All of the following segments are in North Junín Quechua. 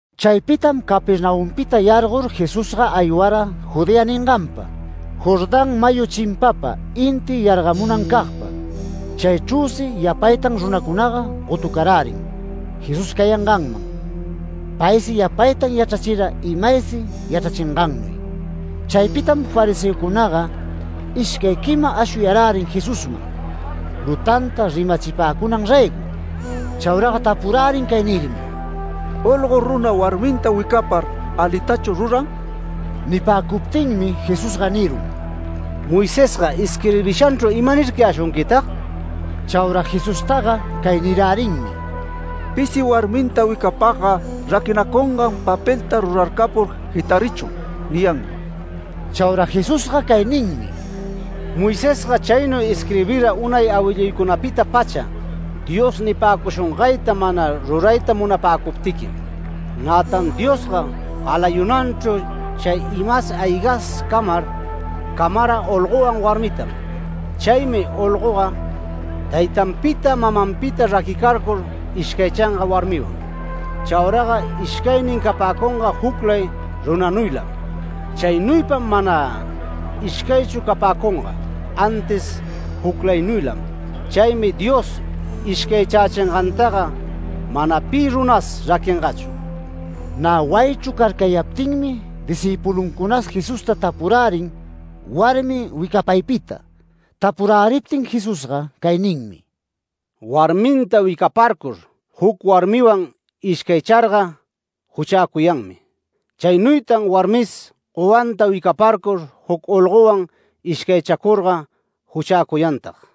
Chaypitam Capernaumpita yargor Jesusga aywara Judea ninganpa, Jordán mayu chimpapa inti yargamunancagpa. Chaychrüsi yapaytam runacunaga gotucarärin Jesús cayanganman. Paysi yapaytan yachrachira imaysi yachrachingannuy. Chaypitam fariseocunaga ishcay quima ashuyarärin Jesusman, lutanta rimachipäcunan raygo. Chauraga tapurärin cay nirmi: “Olgo runa warminta wicapar ¿alitachu ruran?” Nipäcuptinmi Jesusga nirun: “Moisesga isquirbishanchru ¿imanircayäshunquitag?” Chaura Jesustaga cay nirärinmi: “Pisi warminta wicapagga raquinacungan papelta rurarcapur jitarichun” niyanmi. Chaura Jesusga cay ninmi: “Moisesga chaynuy isquirbira unay awilluycunapita-pacha Dios nipäcushungayta mana rurayta munapäcuptiquim. Nätan Diosga galayunanchru chay ima-aygatas camar, camara olgowan warmitam. Chaymi olgoga taytanpita, mamanpita, raquicarcur ishcaychanga warmiwan. Chauraga ishcaynin capäcunga juclay runanuylam. Chaynuypam mana ishcaychu capäcunga, antis juclaynuylam. Chaymi Dios ishcaychächingantaga mana pi runas raquingachu”. Nä wayichru carcayaptinmi discïpuluncunas Jesusta tapurärin warmi wicapaypita. Tapuräriptin Jesusga cay ninmi: “Warminta wicaparcur, juc warmiwan ishcaycharga juchäcuyanmi. Chaynuytan warmis gowanta wicaparcur, juc olgowan ishcaychacurga juchäcuyantag”.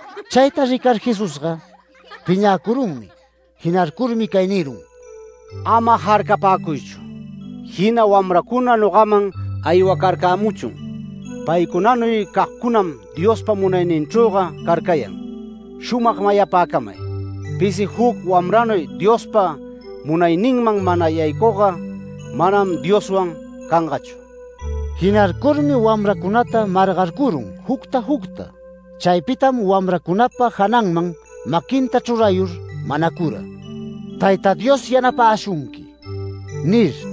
Chayta ricar Jesusga piñäcurunmi. Jinarcurmi cay nirun: “Ama jarcapäcuychu. Jina wamracuna nogaman aywacarcämuchun. Paycunanuy cagcunam Diospa munayninchrüga carcayan. Shumag mayapäcamay: Pisi juc wamranuy Diospa munayninman mana yaycugga, manam Dioswan cangachu”. Jinarcurmi wamracunata margarcurun jucta jucta. Chaypitam wamracunapa jananman maquinta chrurayur manacura: “Tayta Dios yanapäshunqui” nir.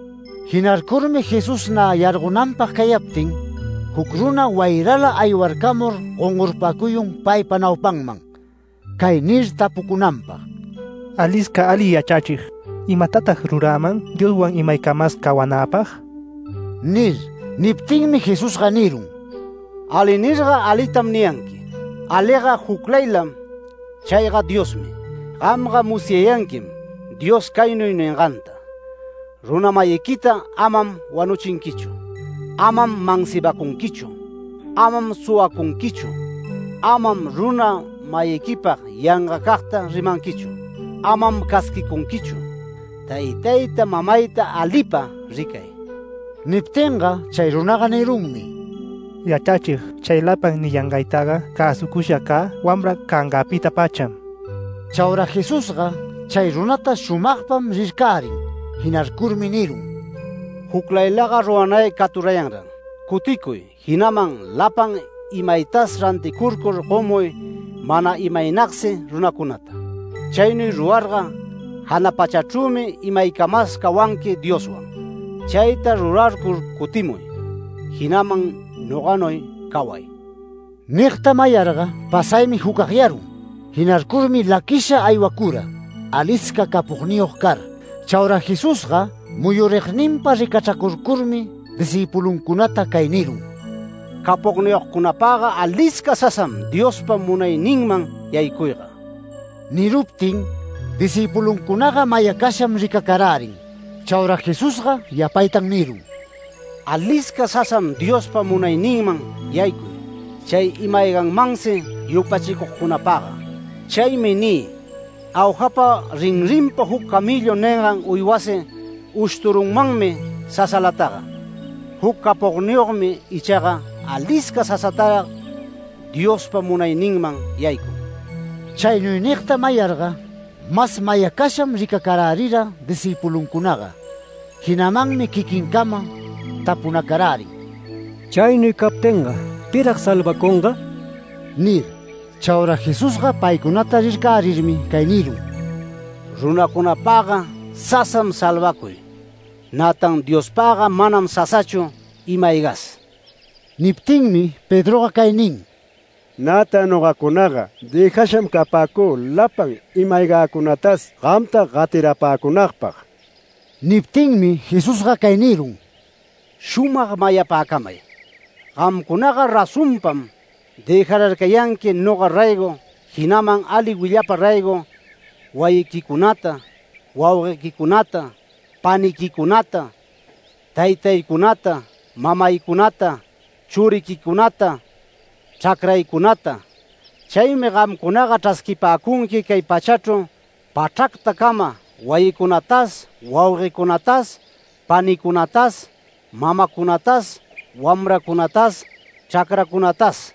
Jinarcurmi Jesús nä yargonanpag cayaptin, juc runa wayrala aywarcamur gongorpacuyun paypa naupanman, cay nir tapucunanpag: “Alisca ali yachrachig, ¿imatatag ruräman Dioswan imaycamas cawanäpag?” nir. Niptinmi Jesusga nirun “ ‘Ali’ nirga, ¿alitam niyanqui? Aliga juclaylam, chayga Diosmi. Gamga musyayanquim, Dios caynuy ninganta: Runa-mayiquita amam wanuchinquichu. Amam mansibacunquichu. Amam suwacunquichu. Amam runa-mayiquipag yangacagta rimanquichu. Amam casquicunquichu. Taytayta, mamayta, alipa ricay”. Niptinga chay runaga nirunmi: “Yachrachig, chay lapan niyangaytaga cäsucusha cä wamra cangäpita-pacham”. Chaura Jesusga chay runata shumagpam rircärin, jinarcurmi nirun: “Juclaylaga ruranay caturayanran. Cuticuy, jinaman lapan imaytas ranticurcur gomuy mana imaynagsi runacunata. Chaynuy rurarga jana pachachrümi imaycamas cawanqui Dioswan. Chayta rurarcur cutimuy, jinaman noganuy caway”. Nigta mayarga pasaymi jucagyarun. Jinarcurmi laquisha aywacura, alisca capogniyog car. Chaura Jesusga muyurigninpa ricachracurcurmi discïpuluncunata cay nirun: “Capogniyogcunapagga alisca sasam Diospa munayninman yaycuyga”. Niruptin discïpuluncunaga mayacasham ricacarärin. Chaura Jesusga yapatan nirun: “Alisca sasam Diospa munayninman yaycuy, chay ima-ayganmansi yupachicugcunapagga. Chaymi nï: Aujapa rinrinpa juc camellu ningan uywasi ushturunmanmi sasalataga, juc capogniyogmi ichaga alisca sasatarag Diospa munayninman yaycun”. Chaynuy nigta mayarga mas mayacasham ricacarärira discïpuluncunaga. Jinamanmi quiquincama tapunacarärin: “Chaynuy captinga, ¿pirag salvacunga?” nir. Chaura Jesusga paycunata rircärirmi cay nirun: “Runacunapagga sasam salvacuy. Nätan Diospaga manam sasachu ima-aygas”. Niptinmi Pedroga cay nin: “Nätan nogacunaga dëjasham capäcü lapan ima-aygäcunatas gamta gatirapäcunagpag”. Niptinmi Jesusga cay nirun: “Shumag mayapäcamay: Gamcunaga razonpam dëjararcayanqui noga raygo, jinaman ali willapa raygo, wayiquicunata, wauguequicunata, paniquicunata, taytaycunata, mamaycunata, churiquicunata, chracraycunata. Chaymi gamcunapa chrasquipäcunqui cay pachachru pachracpacama wayicunatas wauguecunatas panicunatas mamacunatas wamracunatas chracracunatas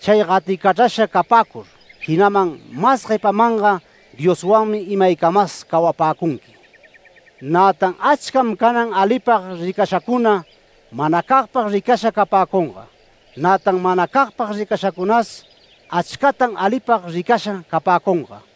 chay gaticachrasha capäcur, jinaman mas guepamanga Dioswanmi imaycamas cawapäcunqui. Nätan achcam canan alipag ricashacuna, manacagpag ricasha capäcunga. Nätan manacagpag ricashacunas, achcatan alipag ricasha capäcunga”.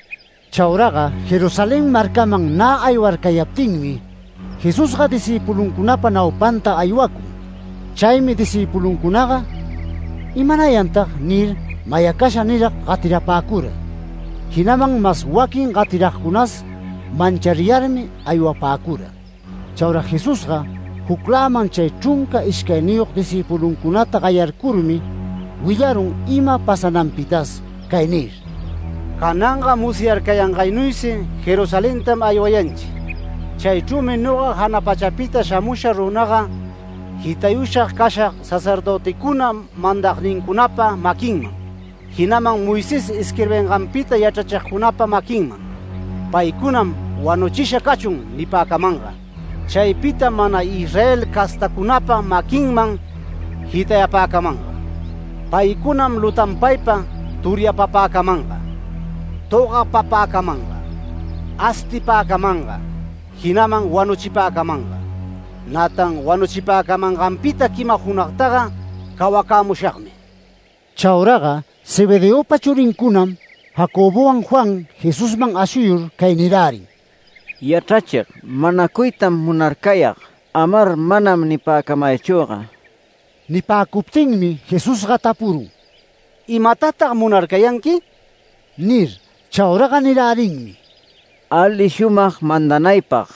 Chauraga Jerusalén marcaman nä aywarcayaptinmi, Jesusga discïpuluncunapa naupanta aywacun. Chaymi discïpuluncunaga “¿Imanayantag?” nir, mayacasha nirag gatirapäcura. Jinaman mas waquin gatiragcunas manchariyarmi aywapäcura. Chaura Jesusga jucläman chay chrunca ishcayniyog discïpuluncunata gayarcurmi willarun ima pasananpitas cay nir: “Cananga musyarcayangaynuysi Jerusalentam aywayanchi. Chaychrümi noga jana pachapita shamusha runaga, jitayusha cashag sacerdöticuna mandagcunapa maquinman, jinaman Moisés isquirbinganpita yachrachigcunapa maquinman. Paycunam ‘Wanuchisha cachun’ nipäcamanga. Chaypitam mana Israel castacunapa maquinman jitayapäcamanga. Paycunam lutanpaypa turyapapäcamanga, togapapäcamanga, astipäcamanga, jinaman wanuchipäcamanga. Nätan wanuchipäcamanganpita quima junagtaga cawacämushagmi”. Chauraga Zebedeopa churincunam, Jacobowan Juan, Jesusman ashuyur cay nirärin: “Yachrachig, manacuytam munarcayag, amar manam nipäcamaychüga”. Nipäcuptinmi Jesusga tapurun: “¿Imatatag munarcayanqui?” nir. Chauraga nirärinmi: “Ali shumag mandanaypag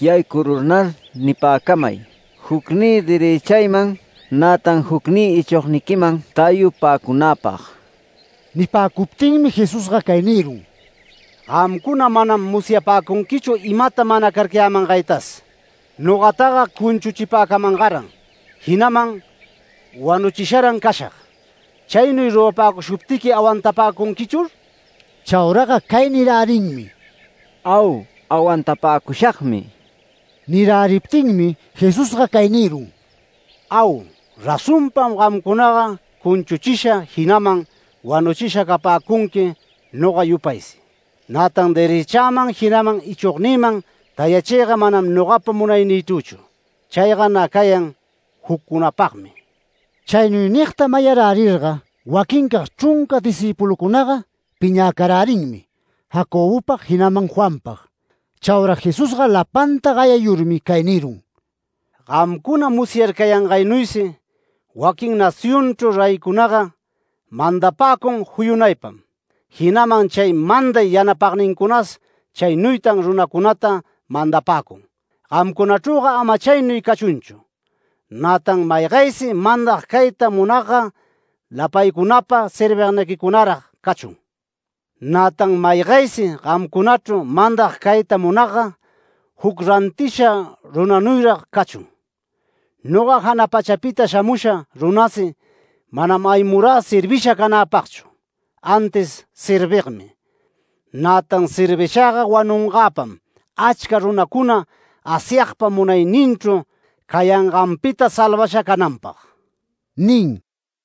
yaycururnar nipäcamay, jucnï derëchayman, nätan jucnï ichogniquiman tayupäcunäpag”. Nipäcuptinmi Jesusga cay nirun: “Gamcuna manam musyapäcunquichu imata manacarcayämaytas. Nogataga cunchuchipäcamangaran, jinaman wanuchisharan cashag. ¿Chaynuy rurapäcushuptiqui awantapäcunquichur?” Chauraga cay nirärinmi: “Au, awantapäcushagmi”. Niräriptinmi Jesusga cay nirun: “Au, razonpam gamcunaga cunchuchisha, jinaman wanuchisha capäcunqui noga yupaysi. Nätan derëchäman, jinaman ichognïman tayachiyga manam nogapa munaynïchrüchu. Chayga nä cayan juccunapagmi”. Chaynuy nigta mayarärirga waquincag chrunca discïpulucunaga piñäcarärinmi, Jacobopag, jinaman Juanpag. Chaura Jesusga lapanta gayayurmi cay nirun: “Gamcuna musyarcayangaynuysi, waquin nacionchru reycunaga, mandapäcun juyunaypam, jinaman chay manday yanapagnincunas chaynuytan runacunata mandapäcun. Gamcunachrüga ama chaynuy cachunchu. Nätan maygaysi mandag cayta munagga lapaycunapa servigniquicunarag cachun. Nätan maygaysi gamcunachru mandag cayta munagga, juc rantisha runanuyrag cachun. Noga jana pachapita shamusha runasi manam aywamurä servisha canäpagchu, antis servigmi. Nätan servishagga wanungäpam achca runacuna Asyagpa munayninchu cayanganpita salvasha cananpag” nin.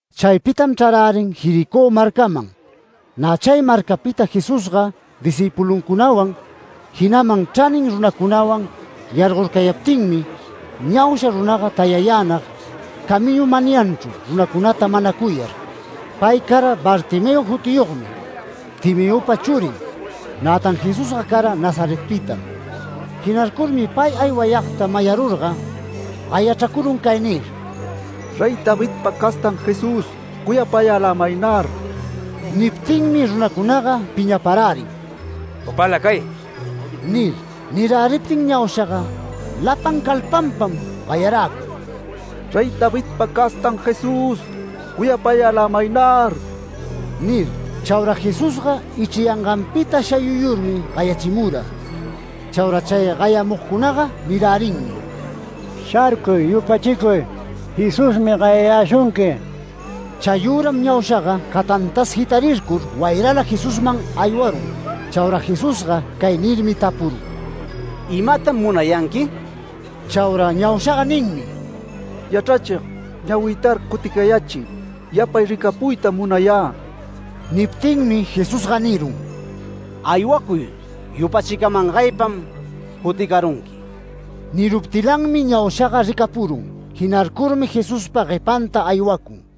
Chaypitam chrarärin Jericó marcaman. Nä chay marcapita Jesusga discïpuluncunawan, jinaman chranin runacunawan yargorcayaptinmi, ñausha runaga tayayänag camiñu manyanchru runacunata manacuyar. Pay cara Bartimeo jutiyogmi, Timeopa churin. Nätan Jesusga cara Nazaretpitam, jinarcurmi pay aywayagta mayarurga, gayachracurun cay nir: “¡Rey Davidpa castan Jesús, cuyapayälämaynar!” Niptinmi runacunaga piñaparärin “Upäla cay” nir. Niräriptin ñaushaga lapan calpanpam gayaräcun: “¡Rey Davidpa castan Jesús, cuyapayälämaynar!” nir. Chaura Jesusga ichriyanganpita shayuyurmi gayachimura. Chaura chay gayamugcunaga nirärinmi: “¡Sharcuy! ¡Yupachicuy! Jesusmi gayayäshunqui”. Chayüram ñaushaga catantas jitarircur wayrala Jesusman aywarun. Chaura Jesusga cay nirmi tapurun: “¿Imatam munayanqui?” Chaura ñaushaga ninmi: “Yachrachig, ñawïtar cuticayächiy, yapay ricapuytam munayä”. Niptinmi Jesusga nirun: “Aywacuy, yupachicamangaypam cuticarunqui”. Niruptilanmi ñaushaga ricapurun, jinarcurmi Jesuspa guepanta aywacun.